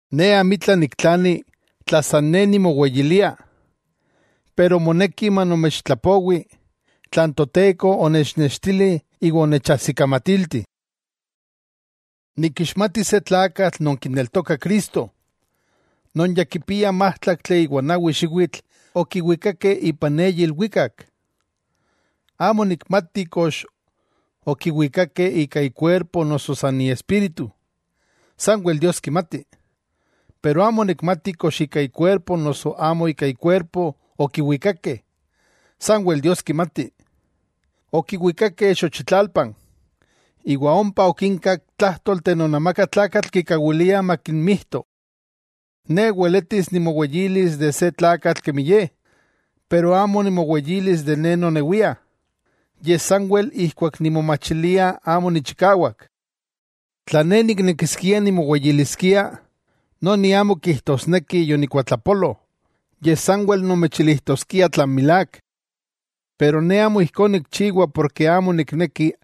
Ne amitla niktlani tla san ne nimoweyilia, moneki manomechtlapowi tlan Toteko onechnextili iwa onechajsikamatilti. Nikixmati se tlakatl non kineltoka Cristo, non ya kipia májtlaktli iwa n nawi xiwitl okiwikakeh ipan eyi ilwikak. Amo nikmati kox okiwikakeh ika ikuerpo noso san iespíritu, sanwel Dios kimati. Amo nikmati kox ika ikuerpo noso amo ika ikuerpo okiwikakeh, sanwel Dios kimati. Okiwikakeh xochitlalpan, iwa ompa okinkak tlájtolteh non amaka tlakah kikawiliah makinmijto. Ne weletis nimoweyilis de se tlakatl kemi ye, pero amo nimoweyilis san ne nonewia, yej sanwel ijkuak nimomachilia amo nichikawak. Tla ne niknekiskia nimoweyiliskia, noni amo kijtosneki yonikuatlapolo, yej sanwel nomechilijtoskia tlan milák. Pero ne amo ijkó nikchiwa porke amo nikneki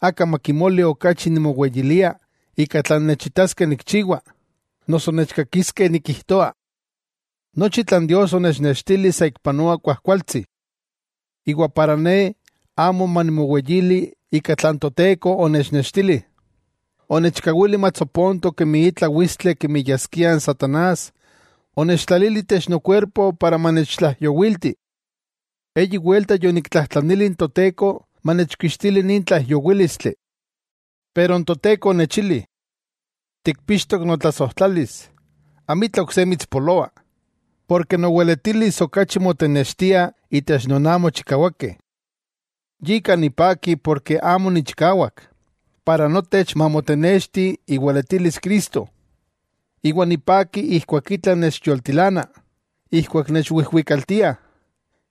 aka makimoli okachi nimoweyilia ika tlan nechitaskeh nikchiwa, noso nechkakiskeh nikijtoa, nochi tlan Dios onechnextili saikpanoa kuajkualtsi. Iwa para ne amo manimoweyili ika tlan Toteko onechnextili, onechkawili matsoponto kemi itla witstli kemi yaskia n satanás onechtlalili itech nokuerpo, para manechtlaijyowilti. Eyi welta yoniktlajtlanili n Toteko manechkixtili nin tlaijyowílistli. Pero n Toteko onechili: “Tikpixtok notlasojtlalis, amitla ok se mitspoloa; noweletilis okachi motenextia itech non amo chikawakeh.” Yika nipaki ken amo nichikawak, para notech mamotenexti iweletilis Cristo. Iwa nipaki keman itla nechyoltilana, ijkuak nechwijwikaltiah,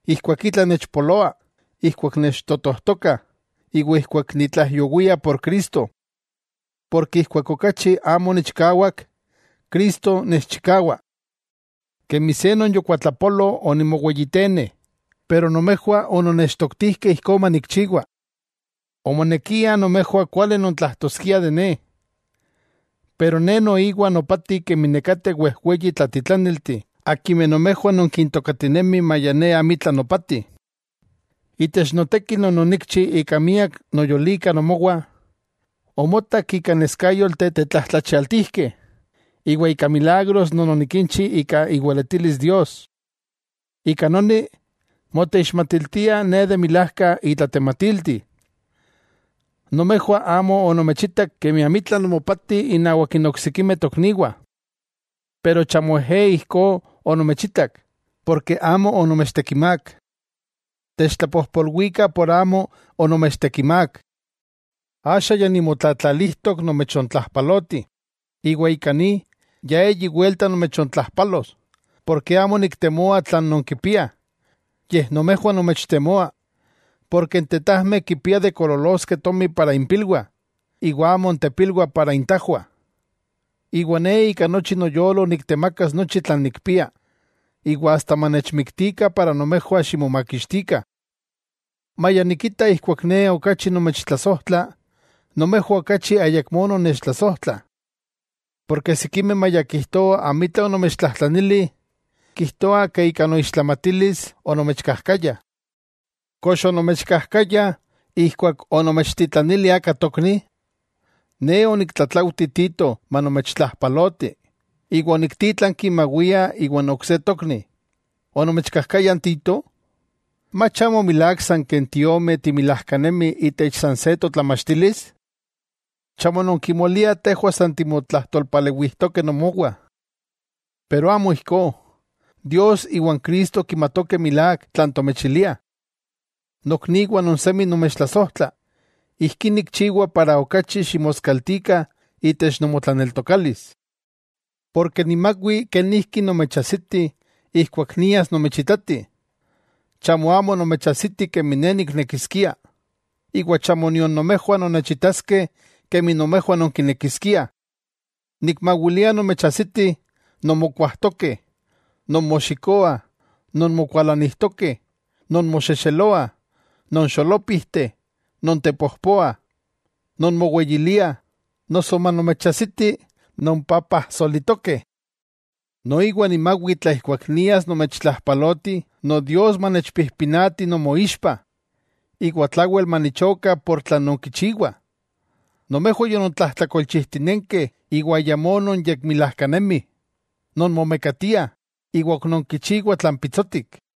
keman itla nechpoloa, keman nechtotojtokah iwa keman nitlaijyowia por Cristo; porke keman amo nichikawak, Cristo nechchikawa. Kemi se non yokuatlapolo onimoweyitene, pero nomejwah ononnechtoktijkeh ijkó manikchiwa. Omonekia nomejwah kuali nontlajtoskiah de ne. Pero ne noiwa nopati kemi nekateh wejweyi tlatitlaniltih akimeh nomejwah nonkintokatinemih maya ne amitla nopati. Itech noteki non onikchi ika miak noyolika nomowah, omotak ika neskayolteh tetlajtlachialtijkeh iwa ika milagros non onikinchi ika iweletilis Dios. Ika noni, moteixmatiltia ne de milajka itlatematilti. Nomejwah amo onomechitak kemi amitla nomopati innawak n oksikimeh tokniwah. Pero chamo ejé ijkó onomechitak, porke amo onomechtekimák, ¡techtlapojpolwikah por amo onomechtekimák! Axa ya nimotlatlalijtok nomechtlajpaloti, iwa ika ni, ya eyi welta nomechontlajpalos, porke amo niktemoa tlan nonkipiah, yej nomejwah nomechtemoa, porke n tetajmeh kipiah de koololoskeh tomi para impilwah, iwa amo n tepilwah para intajwah. Iwa ne ika nochi noyolo niktemakas nochi tlan nikpia, iwa asta manechmiktikah para nomejwah ximomakixtikah; maya nikita ijkuak ne okachi nomechtlasojtla, nomejwah okachi ayakmó nonnechtlasojtlah. Porke sikimeh maya kijtoah amitla onomechtlajtlanili, kijtoah ke ika noixtlamatilis onomechkajkaya. ¿Kox onomechkajkaya, ijkuak onomechtitlanili aka tokni? Ne oniktlatlaujti Tito manomechtlajpaloti, iwa oniktítlanki mawia iwa n ok se tokni. ¿Onomechkajkaya n Tito? ¿Mach amo milák san ken tiomeh timilajkanemih itech san se totlamachtilis? Chamo non kimoliah tejwah san timotlajtolpalewijtokeh nomowah. Pero amo ijkó; Dios iwa n Cristo kimatokeh milák tlan tomechiliah. Nokniwah non semi nomechtlasojtla, ijkí nikchiwa para okachi ximoskaltikah itech nomotlaneltokalis. Porke nimawi kenijki nomechajsiti ijkuak nias nomechitati, chamo amo nomechajsiti kemi ne niknekiskia, iwa chamo nion nomejwah nonnechitaskeh kemi nomejwah nonkinekiskiah. Nikmawilia nomechajsiti, nonmokuajtokeh, nonmoxikoah, nonmokualanijtokeh, nonmoxexeloah, nonxolopijteh, nontepojpoah, nonmoweyiliah, noso manomechajsiti nonpapajsolitokeh. Noiwa nimawi tla ijkuak nias nomechtlajpaloti Nodios manechpijpinati nomoixpa, iwa tlawel manichoka ika tlan nonkichiwah, nomejwah yonontlajtlakolchijtinenkeh iwa ayamó nonyekmilajkanemih, nonmomekatiah iwan ok nonkichiwah tlan pitsotik.